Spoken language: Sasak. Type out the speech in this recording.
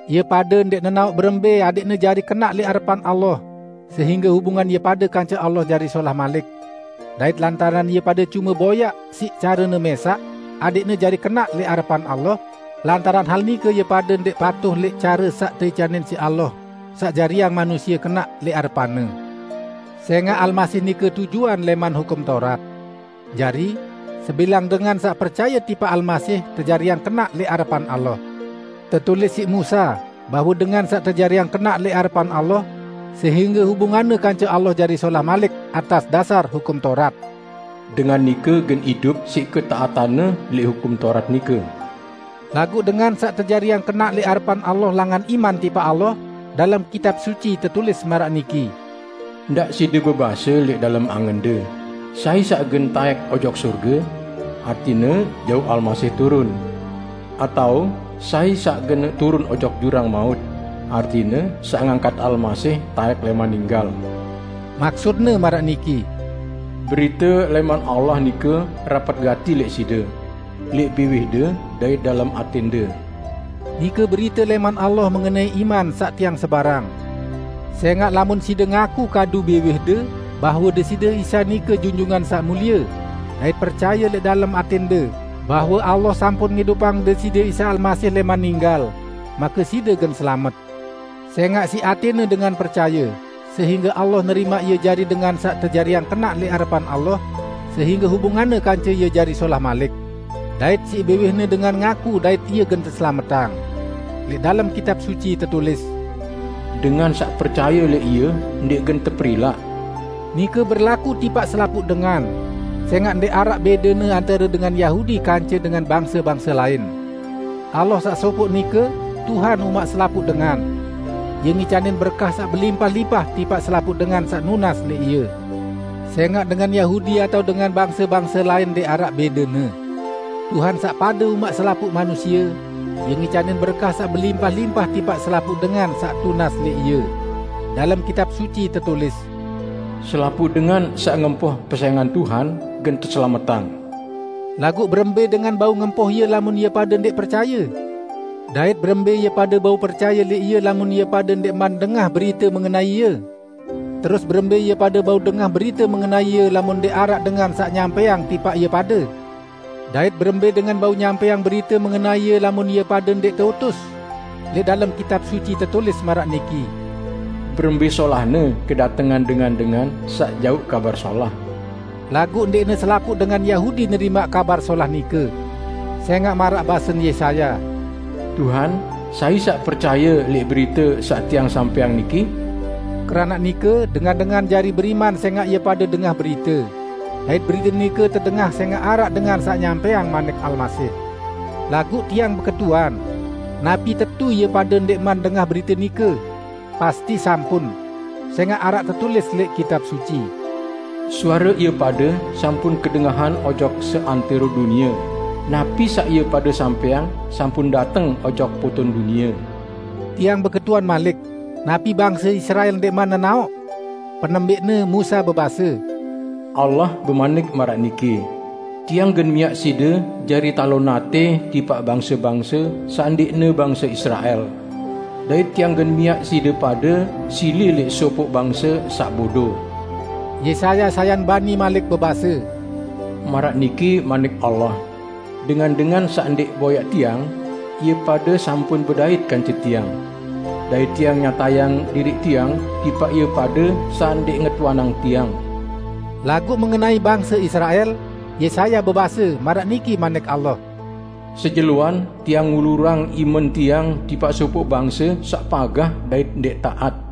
Ie pade ndẽq nenaoq berembẽ adẽqne jari kenaq lẽq arepan Allah sehingge hubungan ie pade kance Allah jari solah malik. Dait lantaran ie pade cume boyaq siq carene mẽsaq adẽqne jari kenaq lẽq arepan Allah, lantaran hal nike ie pade ndẽq patuh lẽq care saq teicanin siq Allah saq jariang manusie kenaq lẽq arepan-Ne. Sẽngaq Almasih nike tujuan lẽman Hukum Taurat. Jari, sebilang dengan saq percaye tipaq Almasih tejariang kenaq lẽq arepan Allah. Tetulis siq Musa bahwe dengan saq tejariang kenaq lẽq arepan Allah sehingge hubunganne kance Allah jari solah malik atas dasar Hukum Taurat, "Dengan nike gen idup siq ketaatanne lẽq Hukum Taurat nike." Laguq dengan saq tejariang kenaq lẽq arepan Allah langan iman tipaq Allah, dalem Kitab Suci tetulis maraq niki, "Ndaq side bebase lẽq dalem angende, 'Sai saq gen taẽk ojok sorge?' (artine jauq Almasih turun), atao, 'Sai saq gen turun ojok jurang maut?' (artine saq ngangkat Almasih taẽk lẽman ninggal)." Maksutne maraq niki, "Berite lẽman Allah nike rapet gati lẽq side; lẽq biwihde dait dalem atẽnde." Nike berite lẽman Allah mengenai iman saq tiang sebarang. Sẽngaq lamun side ngaku kadu biwihde bahwe, Deside Isa nike Junjungan Saq Mulie, dait percaye lẽq dalem atẽnde bahwe Allah sampun ngidupang Deside Isa Almasih lẽman ninggal, make side gen selamet. Sẽngaq siq atẽne dengan percaye sehingge Allah nerimaq ie jari dengan saq tejariang kenaq lẽq arepan Allah sehingge hubunganne kance Ie jari solah malik. Dait siq biwihne dengan ngaku dait ie gen teselametang. Lẽq dalem Kitab Suci tetulis, "Dengan saq percaye lẽq Ie ndẽq gen teperilaq." Nike berlaku tipaq selapuq dengan, sẽngaq ndẽq araq bẽdene antare dengan Yahudi kance dengan bangse-bangse lain. Allah saq sopoq nike, Tuhan umaq selapuq dengan. Ie ngicanin berkah saq belimpah-limpah tipaq selapuq dengan saq nunas lẽq Ie. Sẽngaq dengan Yahudi atao dengan bangse-bangse lain ndẽq araq bẽdene. Tuhan saq pade umaq selapuq manusie, Ie ngicanin berkah saq belimpah-limpah tipaq selapuq dengan saq tunas lẽq Ie. Dalem Kitab Suci tetulis, "Selapuq dengan saq ngempoh pesẽngan Tuhan gen teselametang." Laguq berembẽ dengan bau ngempoh Ie lamun ie pade ndẽq percaye? Dait berembẽ ie pade bau percaye lẽq Ie lamun ie pade ndẽqman dengah berite mengenai Ie? Terus berembẽ ie pade bau dengah berite mengenai Ie lamun ndẽq araq dengan saq nyampẽang tipaq ie pade? Dait berembẽ dengan bau nyampẽang berite mengenai Ie lamun ie pade ndẽq teutus? Lẽq dalem Kitab Suci tetulis maraq niki, "Berembẽ solahne kedatengan dengan-dengan saq jauq Kabar Solah!" Laguq ndẽqne selapuq dengan Yahudi nerimaq Kabar Solah nike. Sẽngaq maraq basen Yesaya, "Tuhan, sai saq percaye lẽq berite saq tiang sampẽang niki?" Keranaq nike, dengan-dengan jari beriman sẽngaq ie pade dengah berite. Dait berite nike tedengah sẽngaq araq dengan saq nyampẽang manik Almasih. Laguq tiang beketuan: Napi tetu ie pade ndẽqman dengah berite nike? Pasti sampun! Sẽngaq araq tetulis lẽq Kitab Suci, "Suare ie pade sampun kedengahan ojok seantẽro dunie, napi saq ie pade sampẽang sampun dateng ojok poton dunie." Tiang beketuan malik: Napi bangse Israel ndẽqman nenaoq? Penembẽqne Musa bebase, "Allah bemanik maraq niki, 'Tiang gen miaq side jari talon atẽ tipaq bangse-bangse saq ndẽqne bangse Israel. Dait tiang gen miaq side pade sili lẽq sopoq bangse saq bodo.' " Yesaya sayan bani malik bebase, "Maraq niki Manik Allah, 'Dengan-dengan saq ndẽq boyaq Tiang, ie pade sampun bedait kance Tiang; dait Tiang nyatayang diriq Tiang tipaq ie pade saq ndẽq ngetuanang Tiang.' " Laguq mengenai bangse Israel, Yesaya bebase, maraq niki Manik Allah, "Sejeloan Tiang ngulurang imen Tiang tipaq sopoq bangse saq pagah dait ndẽq taat."